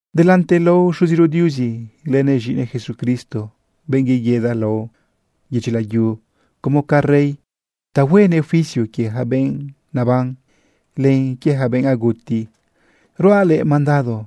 Delante lao Xuziro Diuzi lënëꞌ z̃iꞌinëꞌ Jesucristo, benꞌ yeguida lao yedyi layu como ca rey ta huenëꞌ juicio quie ja benꞌ naban, len quie ja benꞌ aguti, ruaꞌ luëꞌ mandado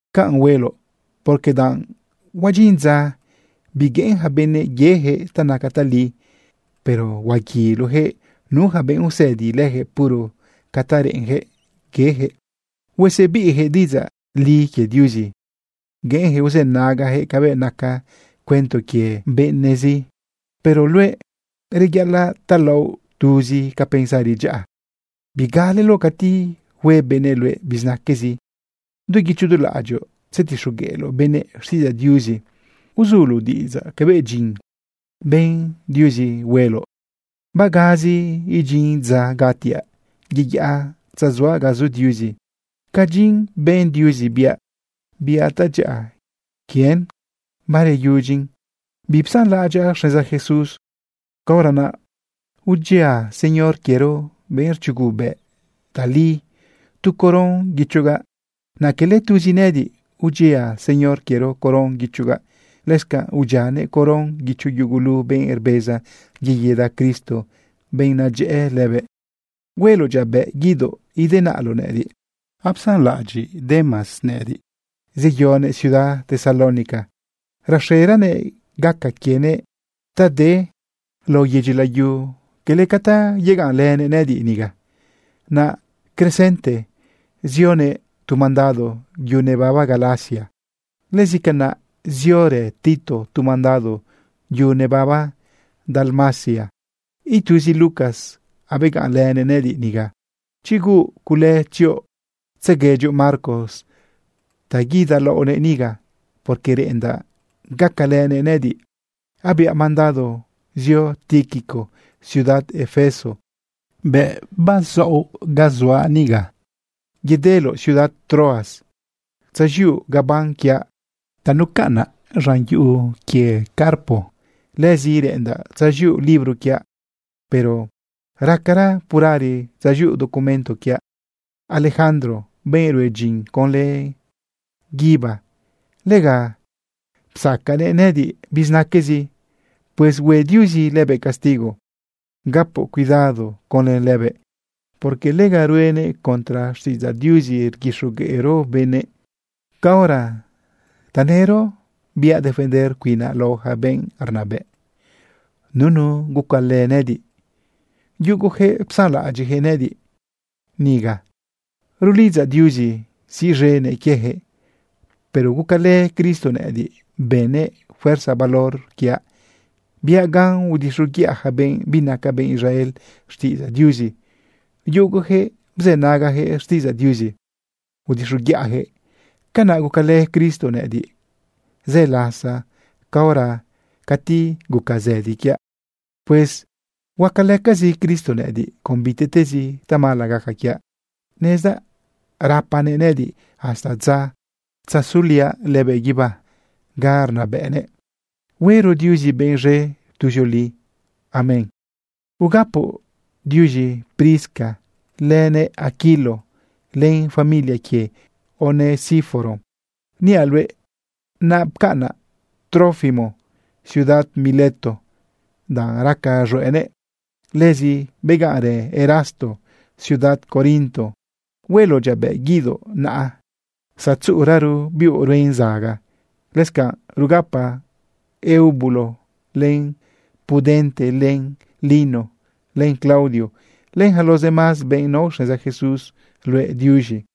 Canꞌ hueloꞌ, porque danꞌ huadyin dza bigueꞌen yaca benëꞌ yejëꞌ ta naca tali, pero huaguiloyaquëꞌ nu yaca benꞌ usëdi lëjëꞌ puro ca ta reꞌenjëꞌ yejëꞌ. Huasebiꞌyaquëꞌ diꞌidzaꞌ li quie Diuzi. Gueꞌenyaquëꞌ uzënagayaquëꞌ cabëꞌ naca cuento quie benëꞌzi. Pero luëꞌ, reyaꞌalaꞌ talaoꞌ tuzi ca pensari dyaꞌa. Bigaleloꞌ cati hue benëꞌ luëꞌ bizinaquezi. Du guicho du laꞌadyoꞌ tzetixogueꞌloꞌ benëꞌ xtiꞌidzaꞌ Diuzi. Uzuloꞌ diꞌidzaꞌ cabëꞌ dyin ben Diuzi rueloꞌ. Bagazi idyin dza gatiaꞌ yeyaꞌa tzazuaꞌ ga zu Diuzi. Ca dyin ben Diuzi biaꞌ, biaꞌ tadyaꞌa quien bareyudyin. Bipsanlaꞌadyaꞌ xneza Jesús. Caora naꞌ udyia Señor quiero, benꞌ rchugobëꞌ tali, tu coron guichogaꞌ. Naꞌ quele tuzi nëꞌëdiꞌ udyia Señor quiero coron guichogaꞌ, lëscanꞌ udyianëꞌ coron guicho yugulu benꞌ rbeza yeguida Cristo, benꞌ nadyëꞌë lëbëꞌ. Hueloꞌ dyabëꞌ guidoꞌ idenaꞌloꞌ nëꞌëdiꞌ. Apsanlaꞌadyiꞌ Demas nëꞌëdiꞌ, zeyonëꞌ ciudad Tesalónica. Raxeranëꞌ gaca quienëꞌ ta de lao yedyi layu cala ca ta yegaꞌnlënëꞌ nëꞌëdiꞌ niga. Naꞌ Crescente zionëꞌ tu mandado yu nebaba Galacia. Lëzi canaꞌ ziorë Tito tu mandado yu nebaba Dalmacia. Ituzi Lucas abegaꞌnlënëꞌ nëꞌëdiꞌ niga. Chi huuꞌ cule, tzioꞌ tzeguedyoꞌ Marcos ta guidalaoꞌnëꞌ niga, porque reꞌendaꞌ gacalënëꞌ nëꞌëdiꞌ. Abiaꞌ mandado zio Tíquico ciudad Efeso. Bëꞌ bazaoꞌ ga zuaꞌ niga, yedeloꞌ ciudad Troas tzaz̃iuꞌ gaban quiaꞌ ta nucaꞌnaꞌ lidyi Carpo. Lëzi reꞌendaꞌ tzaz̃iuꞌ libro quiaꞌ, pero racara purari tzaz̃iuꞌ documento quiaꞌ. Alejandro, benꞌ rue dyin conlë guíba, lega psaquenëꞌ nëꞌëdiꞌ bizinaquezi. Pues hue Diuzi lëbëꞌ castigo. Gapoꞌ cuidado conlë lëbëꞌ, porque lega ruenëꞌ contra xtiꞌidzaꞌ Diuzi rguixogueꞌro benëꞌ. Caora tanëro biaꞌ defender cuinaꞌ lao yaca benꞌ rnabëꞌ, nunu gucalë nëꞌëdiꞌ. Yugojëꞌ psanlaꞌadyiꞌyaquëꞌ nëꞌëdiꞌ niga. Rulidzaꞌ Diuzi siꞌz̃enëꞌ quieyaquëꞌ. Pero gucalë Cristo nëꞌëdiꞌ, bënnëꞌ fuerza valor quiaꞌ. Biaꞌ gan udixoguiꞌa yaca benꞌ binaca benꞌ Israel xtiꞌidzaꞌ Diuzi. Yugojëꞌ bzënagajëꞌ xtiꞌidzaꞌ Diuzi udixoguiꞌayaquëꞌ. Canaꞌ gucalë Cristo nëꞌëdiꞌ zë lasa caora cati guca zëdi quiaꞌ. Pues huacalëcazi Cristo nëꞌëdiꞌ con bitiꞌtezi tamala gaca quiaꞌ. Nezdaꞌ gapanëꞌ nëꞌëdiꞌ hasta dza huetzazuliaꞌ lëbëꞌ guibá ga rnabëꞌnëꞌ. Huero Diuzi benꞌ z̃e tuzioli. Amén. Ugapoꞌ diuz̃i Prisca, lënëꞌ Aquilo, len familia quie Onesíforo. Niaꞌ luëꞌ napcaꞌnaꞌ Trófimo ciudad Mileto danꞌ raca z̃hueꞌnëꞌ. Lëzi begaꞌnrë Erasto ciudad Corinto. Hueloꞌ dyabëꞌ guidoꞌ naꞌa zatzuꞌuraro biuꞌ ruen zaga. Lëscanꞌ rugapa Eubulo, len Pudente, len Lino, len Claudio, len yaca los demás benꞌ nao xneza Jesús, luëꞌ diuz̃i.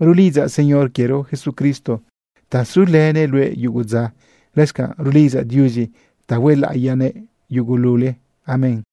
Rulidzaꞌ Señor quiero Jesucristo ta sulënëꞌ luëꞌ yugu dza. Lëscanꞌ rulidzaꞌ Diuzi ta huelaꞌiyanëꞌ yugulule. Amén.